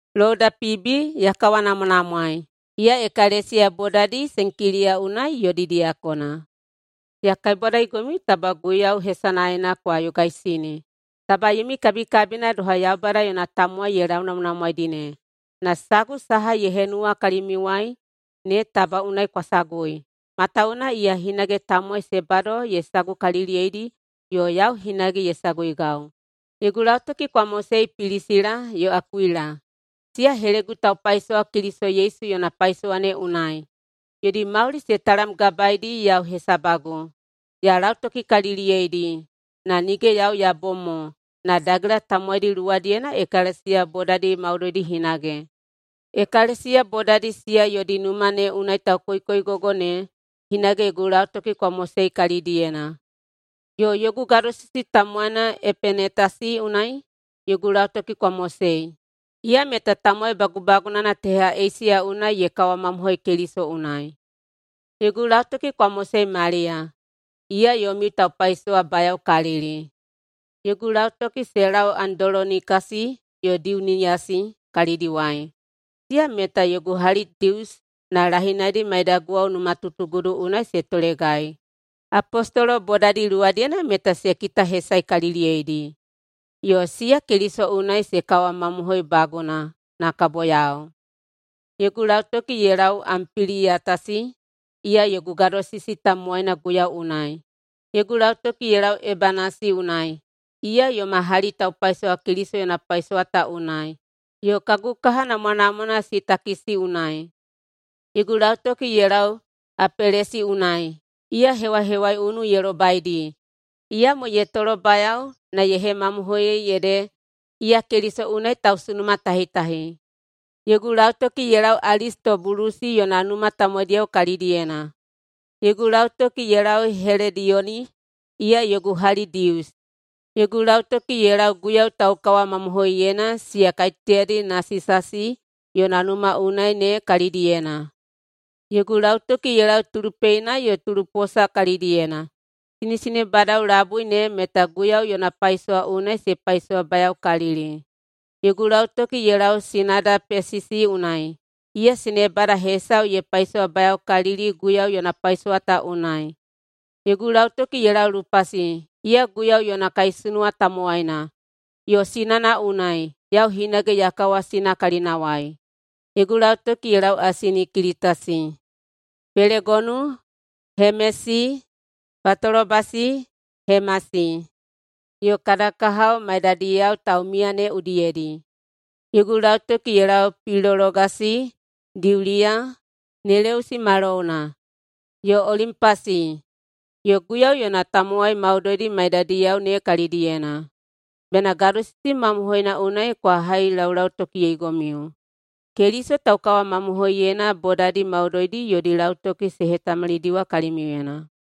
Louda Piibi ya kawanamwanamwaei. Iya ekalesiya bodadi Senkiliya unai yodi diyakona. Ya kaibwadaigomiu taba Guiyau hesanaena kwa yogaisini. Taba yomi kabikabina doha Yaubada yona tamowai ye launamwanamwaedi ne. Na sagu saha ye henuwa kalimiuwai ne taba unai kwa sagui, matawuwuna iya hinage tamowai se bado ye sagukaliliyeidi yo yau hinage ye saguigau. Yogu lautoki kwa mosei Pilisila yo Akuila, siya helegu taupaisowa Keliso Yesu yona paisowa ne unai. Yodi mauli se talamgabaeidi yau hesabagu. Ya lautokikaliliyeidi, na nige yau ya bom mo, na dagela tamowaidi luwadiyena ekalesiya bodadi maudoidi hinage. Ekalesiya bodadi siya yodi numa ne unai taukoikoigogo ne hinage yogu lautoki kwa mosei kalidiyena. Yo yogu gadosisi tamowaina Epenetasi unai yogu lautoki kwa mosei. Iya meta tamowai bagubagunana teha Eisiya unai ye kawamamohoi Keliso unai. Yogu lautoki kwa mosei Maliya. Iya yomiu taupaisowabayaokalili. Yogu lautoki se lau Andolonikasi yo Diuniyasi kalidiwai. Siya meta yogu hali Dius na lahinaidi maidaguwao numatutugudu unai se tolegai. Apostolo bodadi luwadiyena meta se kitahesaekaliliyeidi, yo siya Keliso unai se kawamamohoibaguna na kabo yau. Yogu lautoki ye lau Ampiliyatasi, iya yogu gadosisi tamowaina Guiyau unai. Yogu lautoki ye lau Ebanasi unai, iya yoma hali taupaisowa Keliso yona paisowa ta unai, yo kagu kaha namwanamwana Sitakisi unai. Yogu lautoki ye lau Apelesi unai. Iya hewahewaiunu ye lobaidi, iyamo ye tolobayao na ye hemamohoiyei ede iya Keliso unai tausunumatahitahi. Yogu lautoki ye lau Alistobulusi yona numa tamowaidiyao kalidiyena. Yogu lautoki ye lau Helediyoni, iya yogu hali Dius. Yogu lautoki ye lau Guiyau taukawamamohoiyeina siya kaiteyadi Nasisasi yona numa unai ne kalidiyena. Yogu lautoki ye lau Tulupeina yo Tuluposa kalidiyena. Sinesinebadao labui ne meta Guiyau yona paisowa unai se paisowabayaokalili. Yogu lautoki ye lau sinada Pesisi unai, iya sinebada hesau ye paisowabayaokalili Guiyau yona paisowa ta unai. Yogu lautoki ye lau Lupasi, iya Guiyau yona kaisunuwa tamowaina, yo sinana unai, yau hinage ya kawasina kalinawai. Yogu lautoki ye lau Asinikilitasi, Pelegonu, Hemesi, Patolobasi, Hemasi, yo kada kahao maidadiyao taumiya ne udiyedi. Yogu lautoki ye lau Pilologasi, Diuliya, Neleusi ma louna, yo Olimpasi, yo Guiyau yona tamowai maudoidi maiyadiyao ne kalidiyena. Bena gadosisi mamohoina unai kwa hailaulautokiyeigomiu. Keliso taukawamamohoiyeina bodadi maudoidi yodi lautoki se hetamalidiwa kalimiuyena.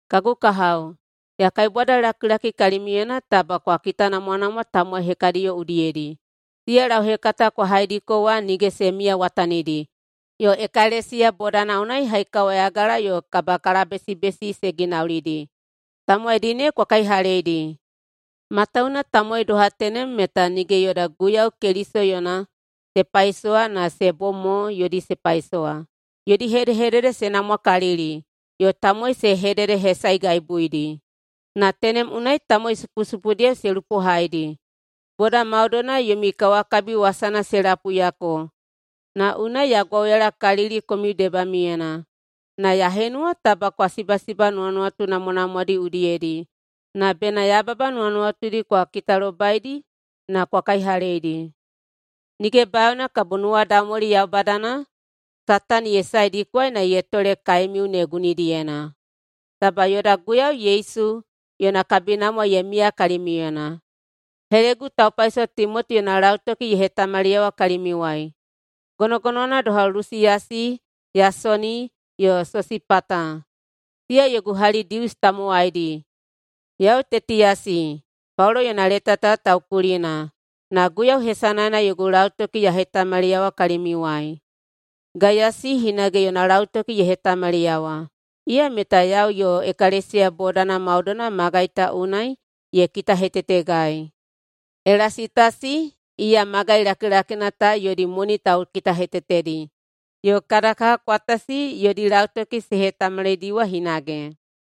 Kagu kahao, ya kaibwadalakilaki kalimiuyena taba kwa kitanamwanamwa tamowai hekadiyo udiyedi, siya lauhekata kwa haidiko wa nige se miyawatanidi yo ekalesiya bodana unai haikawayagala yo kabahekalabesibesi se ginaulidi. Tamowaidi ne kwa kaihaleidi. Matawuwuna tamowai doha tenem meta nige yoda Guiyau Keliso yona se paisowa na se bom mo yodi se paisowa. Yodi hedehedede se namwakalili yo tamowai se hededehesaegaibuidi, na tenem unai tamowai supusupudiyao se lupohaidi. Boda maudoina yomi kawakabi wasana se lapuiyako na unai ya gwauyalakalili komiu debamiuyena. Na ya henuwa taba kwa sibasiba nuwanuwatu namwanamwadi udiyedi na bena yababa nuwanuwatudi kwa kitalobaidi na kwa kaihaleidi. Nige bayaona kabo nuwadaumwali Yaubadana Satani ye saedikwaei na ye tole kaemiu ne gunidiyena. Taba yoda Guiyau Yesu yona kabinamwa ye miya kalimiuyena. Helegu taupaisowa Timoti yona lautoki ye hetamaliyawa kalimiuwai, gonogonowana doha Lusiyasi, Yasona, yo Sosipata, siya yogu hali Dius tamowaidi. Yau Tetiyasi, Paulo yona leta ta taukulina, na Guiyau hesanaena yogu lautoki ya hetamaliyawa kalimiuwai. Gaiyasi hinage yona lautoki ye hetamaliyawa. Iya meta yau yo ekalesiya bodana maudoina magai ta unai ye kitahetetegai. Elasitasi, iya magai lakilakina ta yodi moni taukitahetetedi, yo kada kaha Kwatasi yodi lautoki se hetamalidiwa hinage.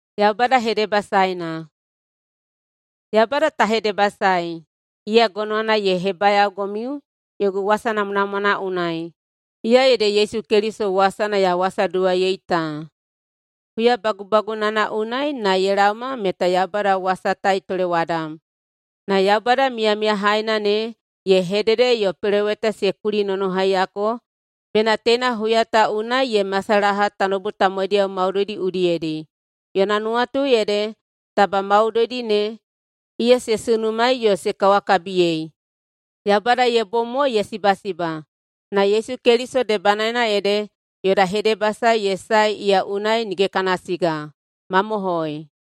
Yaubada ta hedebasaei! Iya gonowana ye hebayaogomiu yogu wasa namwanamwana unai, iya ede Yesu Keliso wasana ya wasaduwaiyei ta. Huya bagubagunana unai na ye laoma meta Yaubada wasa ta ye tolewadam. Na Yaubada miyamiyahaina ne ye hedede yo peloweta se kulinonohaiyako bena teina huya ta unai ye masalaha tanoubu tamowaidiyao maudoidi udiyedi. Yona nuwatu ede taba maudoidi ne iya se sunumaei yo se kawakabiyei. Yaubada ye bom mo ye sibasiba, na Yesu Keliso debanaena ede yoda hedebasae ye sae iya unai nige kana siga. Mamohoi!